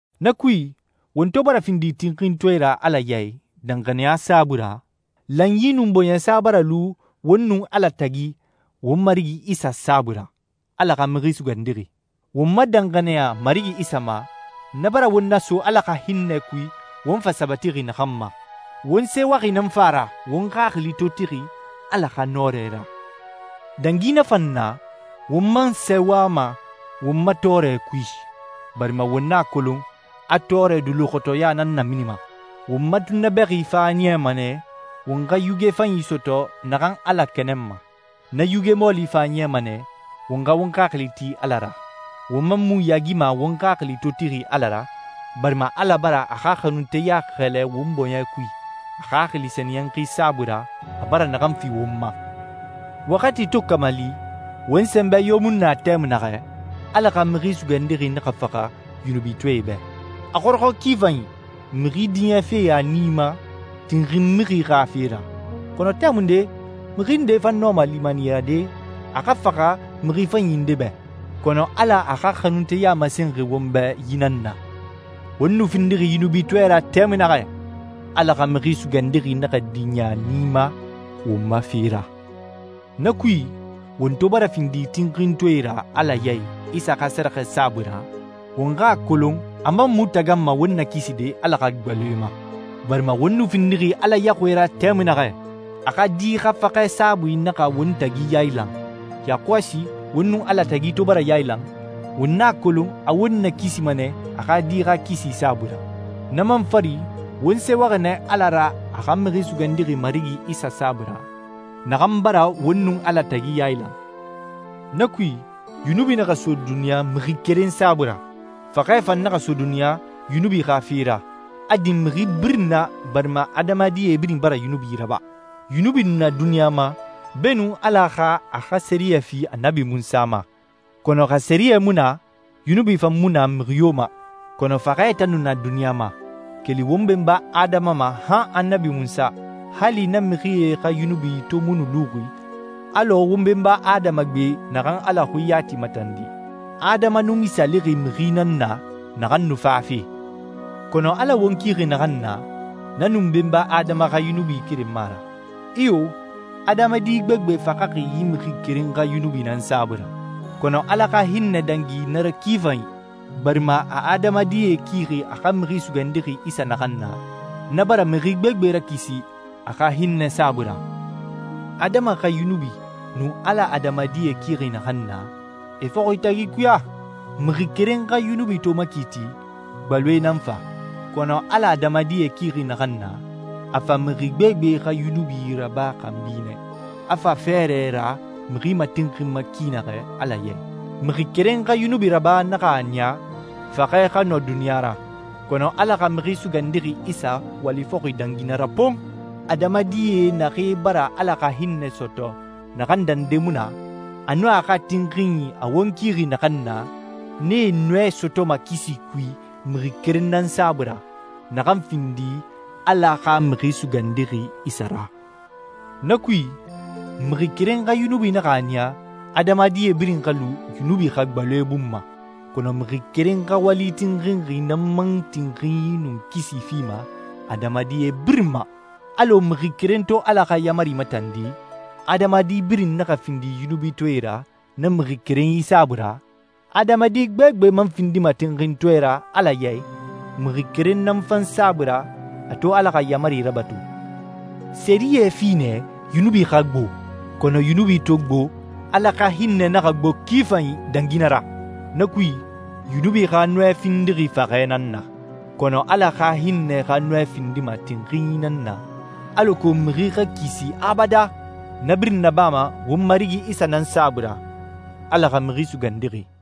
Na kui won to bara findi tinxintɔɛe ra Ala ya i danxaniya saabui ra, lanyi nun bɔɲɛsa bara lu won nun Ala tagi won Marigi Isa saabui ra, Ala xa Mixi Sugandixi. Won ma danxaniya Marigi Isa ma, na bara won naso Ala xa hinnɛ kui won fa sabatixi naxan ma. Won sɛɛwaxi nan fa a ra won xaxili to tixi Ala xa nɔrɛ ra. Dangi na fan na, won man sɛɛwama won ma tɔɔrɛ kui, barima won a kolon a tɔɔrɛ duluxɔtɔya nan naminima. Won ma tunnabɛxi fan a niyama nɛ won xa yuge fanyi sɔtɔ naxan Ala kɛnɛnma. Na yuge mɔɔli fan a niyama nɛ won xa won xaxili ti Ala ra. Won man mu yaagima won xaxili to tixi Ala ra, barima Ala bara a xa xanunteya xɛlɛ won bɔɲɛ kui a Xaxili Sɛniyɛnxi saabui ra a bara naxan fi won ma. Waxati to kamali, won sɛnbɛ yo mu nu na tɛmui naxɛ, Ala xa Mixi Sugandixi naxa faxa yunubitɔɛe bɛ. A xɔrɔxɔ ki fanyi mixi diɲɛfe a nii ma tinxin mixi xa fe ra. Kɔnɔ tɛmunde, mixi nde fan nɔma limaniyade a xa faxamixi fanyi nde bɛ. Kɔnɔ Ala a xa xanunteya masenxi won bɛ yi nan na: Won nu findixi yunubitɔɛe ra tɛmui naxɛ, Ala xa Mixi Sugandixi naxa diɲɛ a nii ma won ma fe ra. Na kui, won to bara findi tinxintɔɛe ra Ala ya i Isa xa sɛrɛxɛ saabui ra, won xa a kolon a man mu taganma won nakiside Ala xa gbaloe ma. Barima won nu findixi Ala yaxuie ra tɛmui naxɛ, a xa Di xa faxɛ saabui naxa won tagi yailan, yakɔsi won nun Ala tagi to bara yailan, won a kolon a won nakisima nɛ a xa Di xa kisi saabui ra. Na man fari, won sɛɛwaxi nɛ Ala ra a xa Mixi Sugandixi Marigi Isa saabui ra, naxan bara won nun Ala tagi yailan. Na kui, yunubi naxa so duniɲa mixi keren saabui ra. Faxɛ fan naxa so duniɲa yunubi xa fe ra, a din mixi birin na barima adamadie birin bara yunubi raba. Yunubi nu na duniɲa ma beenun Ala xa a xa sɛriyɛ fi Annabi Munsa ma, kɔnɔ xa sɛriyɛ mu na, yunubi fan mu na mixi yo ma. Kɔnɔ faxɛ tan nu na duniɲa ma, keli won benba Adama ma han Annabi Munsa, hali na mixie xa yunubi to mu nu luxi alɔ won benba Adama gbe naxan Ala xui yati matandi. Adama nu misaalixi mixi nan na naxan nu fafe. Kɔnɔ Ala won kixi naxan na, na nun Benba Adama xa yunubi keren mu a ra. Iyo, adamadi gbegbe faxaxi yi mixi keren xa yunubi nan saabui ra, kɔnɔ Ala xa hinnɛ dangi na ra ki fanyi, barima a adamadie kixi a xa Mixi Sugandixi Isa naxan na, na bara mixi gbegbe rakisi a xa hinnɛ saabui ra. Adama xa yunubi nun Ala adamadie kixi naxan na, e fɔxi tagi ikuya. Mixi keren xa yunubi to makiiti, gbaloe nan fa. Kɔnɔ Ala adamadie kixi naxan na, a fa mixi gbegbe xa yunubi raba xanbi nɛ, a fa fɛɛrɛ ra mixi matinxinma ki naxɛ Ala ya i. Mixi keren xa yunubi raba naxa a niya faxɛ xa nɔ duniɲa ra, kɔnɔ Ala xa Mixi Sugandixi Isa wali fɔxi dangi na ra pon! Adamadie naxee bara Ala xa hinnɛ sɔtɔ naxan dande mu na, a nun a xa tinxinyi a won kixi naxan na, nee nɔɛ sɔtɔma kisi kui mixi keren nan saabui ra, naxan findi Ala xa Mixi Sugandixi Isa ra. Na kui, mixi keren xa yunubi naxa a niya adamadie birin xa lu yunubi xa gbaloe bun ma, kɔnɔ mixi keren xa wali tinxinxi nan man tinxinyi nun kisi fima adamadie birin ma. Alɔ mixi keren to Ala xa yaamari matandi, adamadi birin naxa findi yunubitɔɛe ra na mixi kerenyi saabui ra, adamadi gbegbe man findima tinxintɔɛe ra Ala ya i mixi keren nan fan saabui ra a to Ala xa yaamari rabatu. Sɛriyɛ fi nɛ yunubi xa gbo. Kɔnɔ yunubi to gbo, Ala xa hinnɛ naxa gbo ki fanyi dangi na ra! Na kui, yunubi xa nɔɛ findixi faxɛ nan na, kɔnɔ Ala xa hinnɛ xa nɔɛ findima tinxinyi nan na alako mixi xa kisi abadan. Na birin nabama won Marigi Isa nan saabui ra, Ala xa Mixi Sugandixi.